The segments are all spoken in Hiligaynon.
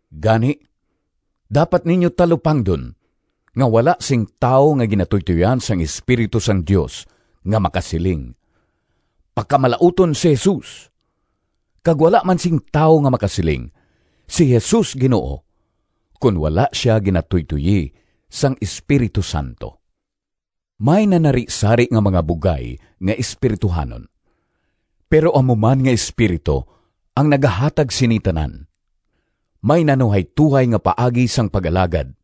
Gani, dapat ninyo talupangdon nga wala sing tawo nga ginatuytoyan sang Espiritu sang Dios nga makasiling, “Pakamalauton si Jesus!”, kag wala man sing tawo nga makasiling, “Si Jesus Ginoo,” kon wala sia ginatuytoyi sang Espiritu Santo. May nanarisari nga mga bugay nga espirituhanon, pero amo man nga Espiritu ang nagahatag sini tanan. May nanuhaytohay nga paagi sang pag-alagad,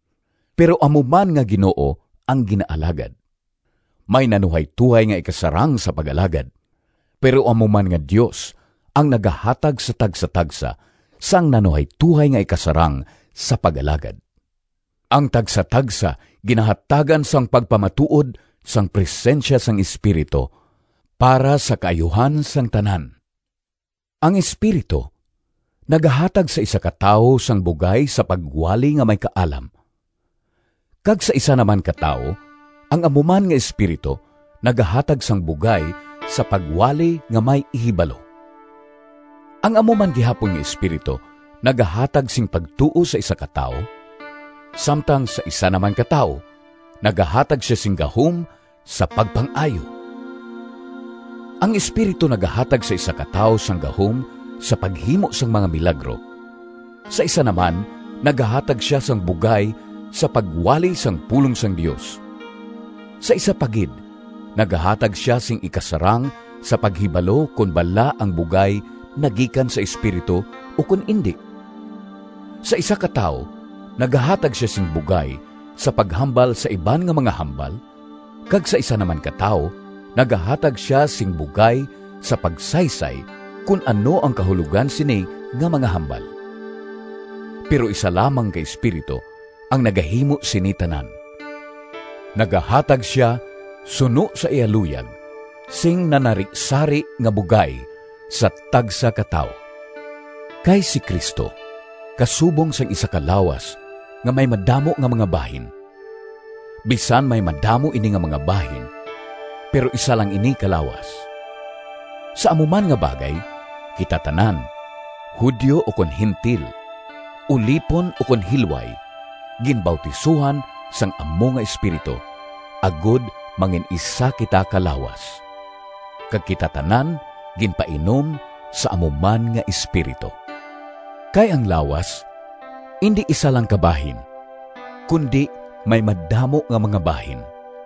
pero amo man nga Ginoo ang ginaalagad. May nanuhaytohay nga ikasarang sa pag-alagad, pero amo man nga Dios ang nagahatag sa tagsatagsa sang nanuhaytohay nga ikasarang sa pag-alagad. Ang tagsatagsa ginahatagan sang pagpamatuod sang presensya sang Espiritu para sa kaayuhan sang tanan. Ang Espiritu nagahatag sa isa ka tawo sang bugay sa pagwali nga may kaalam, kag sa isa na man ka tawo ang amo man nga Espiritu nagahatag sang bugay sa pagwali nga may ihibalo. Ang amo man gihapon nga Espiritu nagahatag sing pagtuo sa isa ka tawo, samtang sa isa na man ka tawo nagahatag sia sing gahom sa pagpang-ayo. Ang Espiritu nagahatag sa isa ka tawo sang gahom sa paghimo sang mga milagro, sa isa na man nagahatag sia sang bugay sa pagwali sang pulong sang Dios, sa isa pa gid nagahatag sia sing ikasarang sa paghibalo kon bala ang bugay nagikan sa Espiritu ukon indi. Sa isa ka tawo nagahatag sia sing bugay sa paghambal sa iban nga mga hambal kag sa isa na man ka tawo nagahatag sia sing bugay sa pagsaysay kon ano ang kahulogan sini nga mga hambal. Pero isa lamang ka Espiritu ang nagahimo sini tanan. Nagahatag sia suno sa iya luyag sing nanarisari nga bugay sa tagsa ka tawo. Kay si Cristo kasubong sang isa ka lawas nga may madamo nga mga bahin. Bisan may madamo ini nga mga bahin, pero isa lang ini ka lawas. Sa amo man nga bagay, kita tanan, Judio ukon Gentil, ulipon ukon hilway, ginbautisohan sang amo nga Espiritu, agod mangin-isa kita ka lawas, kag kita tanan ginpainom sa amo man nga Espiritu. Kay ang lawas indi isa lang ka bahin, kundi may madamo nga mga bahin.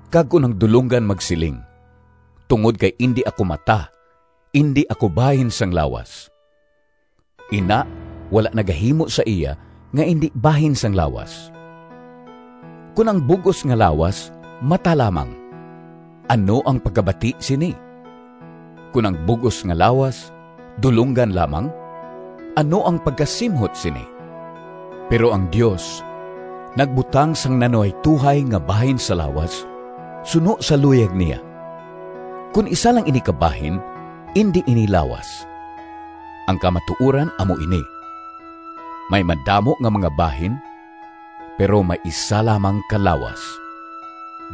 Kag kon ang dulonggan magsiling, “Tungod kay indi ako mata, indi ako bahin sang lawas,” ina wala nagahimo sa iya nga indi bahin sang lawas. Kon ang bug-os nga lawas mata lamang, ano ang pagkabati sini? Kon ang bug-os nga lawas dulonggan lamang, ano ang pagkasimhot sini? Pero ang Dios nagbutang sang nanuhaytohay nga bahin sa lawas suno sa luyag niya. Kon isa lang ini ka bahin indi ini lawas. Ang kamatuoran amo ini, may madamo nga mga bahin, pero may isa lamang ka lawas.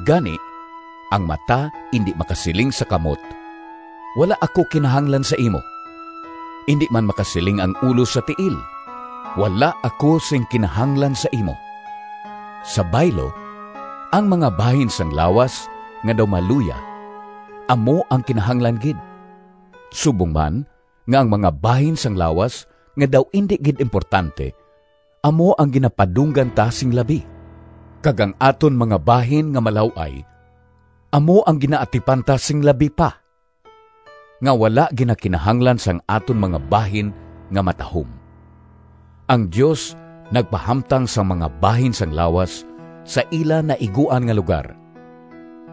Gani, ang mata indi makasiling sa kamot, “Wala ako sing kinahanglan sa imo!” Indi man makasiling ang ulo sa tiil, “Wala ako sing kinahanglan sa imo!” Sa baylo, ang mga bahin sang lawas nga daw maluya amo ang kinahanglan gid, subong man, nga ang mga bahin sang lawas nga daw indi gid importante amo ang ginapadunggan ta sing labi, kag ang aton mga bahin nga malaw-ay amo ang ginaatipan ta sing labi pa, nga wala ginakinahanglan sang aton mga bahin nga matahom. Ang Dios nagpahamtang sang mga bahin sang lawas sa ila naiguan nga lugar,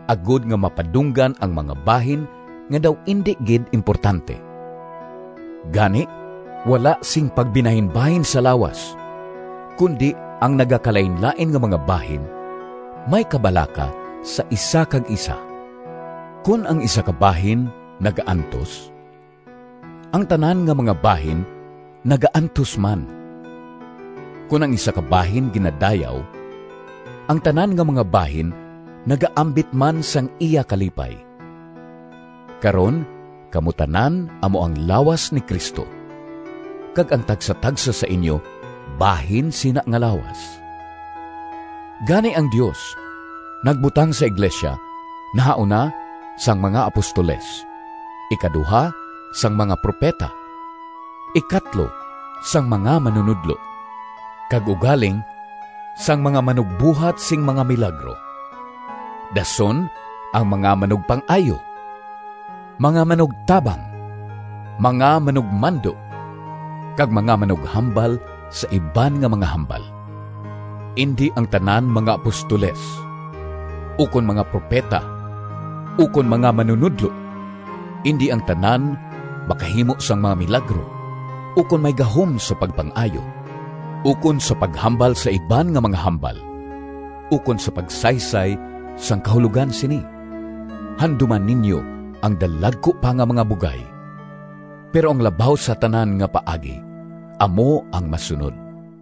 agod nga mapadunggan ang mga bahin nga daw indi gid importante. Gani wala sing pagbinahinbahin sa lawas, kundi ang nagakalainlain nga mga bahin may kabalaka sa isa kag isa. Kon ang isa ka bahin nagaantos, ang tanan nga mga bahin nagaantos man. Kon ang isa ka bahin ginadayaw, ang tanan nga mga bahin nagaambit man sang iya kalipay. Karon kamo tanan amo ang lawas ni Cristo, kag ang tagsatagsa sa inyo bahin sina nga lawas. Gani, ang Dios nagbutang sa iglesia, nahauna, sang mga apostoles; ikaduha, sang mga propeta; ikatlo, sang mga manunodlo; kag ugaling sang mga manugbuhat sing mga milagro, dason ang mga manugpang-ayo, mga manugtabang, mga manugmando, kag mga manughambal sa iban nga mga hambal. Indi ang tanan mga apostoles, ukon mga propeta, ukon mga manunodlo. Indi ang tanan makahimo sang mga milagro, ukon may gahom sa pagpang-ayo, ukon sa paghambal sa iban nga mga hambal, ukon sa pagsaysay sang kahulogan sini. Handuma ninyo ang dalagku pa nga mga bugay. Pero ang labaw sa tanan nga paagi amo ang masunod.